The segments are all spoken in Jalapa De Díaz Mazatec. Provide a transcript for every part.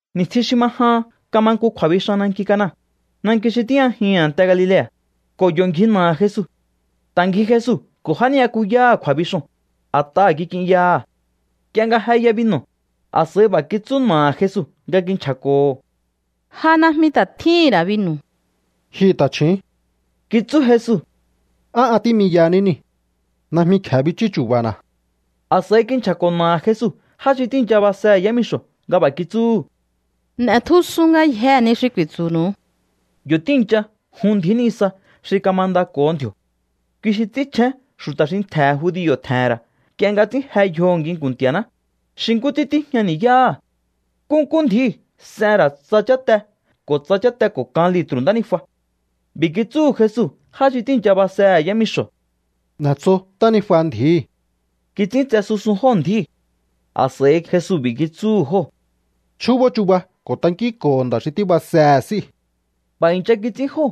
Ni̱stjin xi ma jahan kama nku kju̱a̱bixan nanki Cana, nanki xi tíjñajihi̱n a̱nte Galilea̱, ko̱ yo̱ ngji na̱aha̱ Jesu. Ta̱ ngji Jesu ko̱ já ni'yakuyáha̱ kju̱a̱bixoo̱n, a̱t'aha̱ kik'inyaha̱. Nk'ie nga jeya binu̱, a̱s'a̱i b'a̱ kitsú na̱aha̱ Jesu nga kinchja̱ko̱ho̱: —Ja najmi ta̱ tjíhi̱n ra̱ binu̱. —Ji ta̱chju̱ún —kitsú Jesu—, ¿á an tí'miyahaní niu̱? Najmi kje̱e bichú chu̱ba̱na̱. A̱s'a̱i kinchja̱ko̱ na̱aha̱ Jesu já xi tíi̱ncha basehe̱ yámixo̱ nga b'a̱ kitsúhu̱: —N'e̱tjusun ngayjee̱ ni xi ku̱i̱tsu̱nu̱u. Yo̱ tíi̱ncha jun ndji̱í nisa xi kamandako̱ho ndji̱o̱. Kui xi ts'ínchjén xu̱ta̱ xi ntje̱ judio̱ tje̱he̱n ra̱ nk'ie nga ts'ín je yjoho̱ nginku̱n Nti̱a̱ná, xi nkú ts'ín tíjña ni̱yáha̱. Nkúnkú ndji̱íu̱ s'en ra̱ tsa cháte ko̱ tsa cháte ko̱ kan litru̱ ntánijua. B'i̱ kitsúhu̱ Jesu já xi tíi̱ncha basehe̱ yámixo̱: —N'e̱tso ntánijua ndji̱íi̱. Kits'íntse susun jóo̱ ndji̱íu̱. A̱s'a̱i Jesu b'i̱ kitsúhu̱ jóo̱: —Chjúbó chuba ko̱ tankínko̱ho nda̱ xi tíbasehe̱ s'íu̱. B'a̱ i̱ncha kits'ín jóo̱.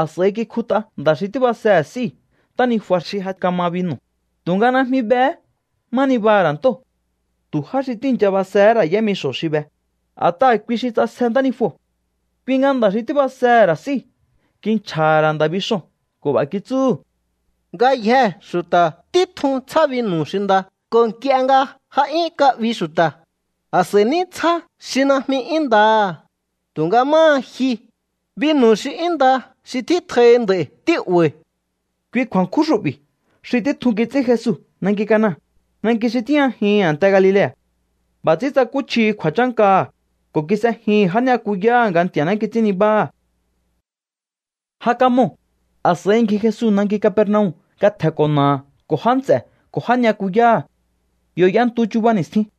A̱s'a̱i kikjut'a nda̱ xi tíbasehe̱ s'íu̱ ntánijua xi ja kama binu̱, tu̱nga najmi behé má nibaha̱ ra̱ ntóo̱. Tu̱ já xi tíi̱ncha basehé ra̱ yámixo̱ xi be, a̱t'aha̱ kui xi ts'asje ntánijuo̱. Kui nga nda̱ xi tíbasehe̱ ra̱ s'íu̱ kinchja̱ha̱ ra̱ nda̱ bixoo̱n ko̱ b'a̱ kitsúhu̱: —Ngayjee̱ xu̱ta̱ títjun tsjá binu̱ xi nda ko̱ nk'ie nga ja 'yún ka'bi xu̱ta̱, a̱s'a̱i ní tsjá xi najmi 'yún ndaha̱. Tu̱nga máha ji, binu̱ xi 'yún nda xi tjítjoihi nd'a̱i̱ tí'ba̱i̱. Kui kju̱a̱nkjún xu'bi̱ xi títjun kits'ín Jesu nanki Cana, nanki xi tíjñajihi̱n a̱nte Galilea̱. B'a̱ ts'ín tsakúchjihi kju̱a̱chánkaha̱, ko̱ kis'ejihi̱n já ni'yakuyáha̱ nga Nti̱a̱ná kits'ín nibáha̱. Ja kamoo̱. A̱s'a̱i ngji Jesu nanki Capernaum nga tje̱nko̱ na̱aha̱ ko̱ já nts'e̱ ko̱ já ni'yakuyáha̱. Yo̱ y'entu chuba ni̱stjin.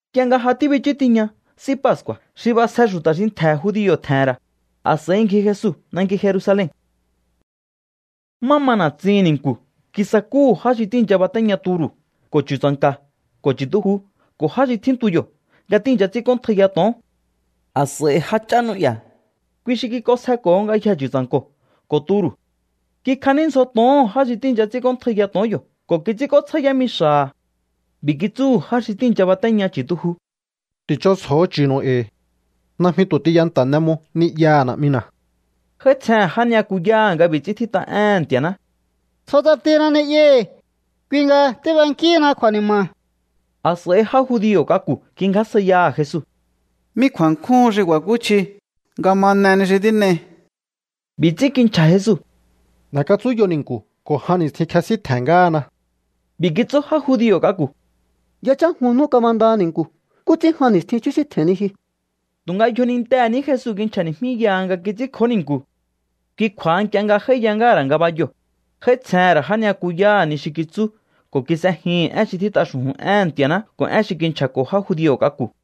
Nk'ie nga ja tíbichú tiña S'í Pascu̱a̱ xi b'asje xu̱ta̱ xi ntje̱ judio̱ tje̱he̱n ra̱, a̱s'a̱i ngji Jesu nanki Jerusalen. Má ma na̱tsihi̱n ni̱nku̱ kisakúhu̱ já xi tíi̱ncha batéña turu̱ ko̱ chu̱tsa̱nka̱ ko̱ chu̱tuju ko̱ já xi tjíntu yo̱ nga tíi̱ncha ts'ínk'óntjaiya to̱on. A̱s'a̱i jách'á n'ú'ya̱, kui xi kik'onsjeko̱ho ngayjee̱ chu̱tsa̱nko̱ ko̱ turu̱. Kikjaní ndzjo to̱oho̱n já xi tíi̱ncha ts'ínk'óntjaiya to̱on yo̱ ko̱ kits'ínk'ótsjá yámixa̱ha̱. B'i̱ kitsúhu̱ já xi tíi̱ncha batéña chu̱tuju: —Ti̱ch'onsjo̱o chu̱nu̱u e̱i̱. Najmi tu̱ tiyanta̱ n'e mo ni'yaha̱ Na̱'mina̱. J'áítsjehe̱n já ni'yakuyáha̱ nga b'i̱ ts'ín tjít'a éhe̱n Nti̱a̱ná: “Tjo ts'atina ni'yahi̱, kui nga tíb'enkíhina kju̱a̱ni̱ma̱.” A̱s'a̱i já judio̱ k'aku̱ kingjásjaiyaha̱ Jesu: —¿Mí kju̱a̱nkjúhun xi ku̱a̱kúchji nga ma n'e ni xi tín'ei? B'i̱ ts'ín kinchja̱ Jesu: —N'e̱katsúnyo ni̱nku̱ ko̱ jan ni̱stjin kjesíntje̱n ngáhana. B'i̱ kitsú já judio̱ k'aku̱: —Yachán jun nú kamandaha ni̱nku̱. ¿Nkú ts'ín jan ni̱stjin chjúsíntje̱henni ji? Tu̱nga yjonintehe̱ ní Jesu kinchja̱ni̱jmíyaha nga kits'ínkjó ni̱nku̱. Kui kju̱a̱ha, nk'ie nga j'áíya ngáha̱ ra̱ ngabayoo̱, j'áítsjehe̱n ra̱ já ni'yakuyáha̱ ni xi kitsú ko̱ kis'ejihi̱n én xi tjít'a xu̱ju̱n éhe̱n Nti̱a̱ná ko̱ én xi kinchja̱ko̱ já judio̱ k'aku̱.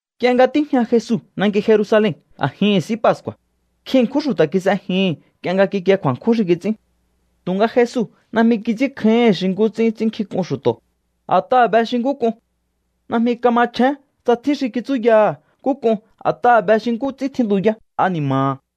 Nk'ie nga tíjña Jesu nanki Jerusalen a̱jihi̱n S'í Pascu̱a̱, nkjin ṉkjún xu̱ta̱ kis'ejihi̱n nk'ie nga kikie kju̱a̱nkjún xi kits'ín. Tu̱nga Jesu najmi kits'ínkjáíhi̱n xi nkú ts'ín ts'ínnkjink'un xu̱to̱, a̱t'aha̱ be xi nkú k'un. Najmi kamachjén tsa tjín xi kitsúyaha̱ nkú k'un, a̱t'aha̱ be xi nkú ts'ín tjíntuyá ani̱ma̱ha̱.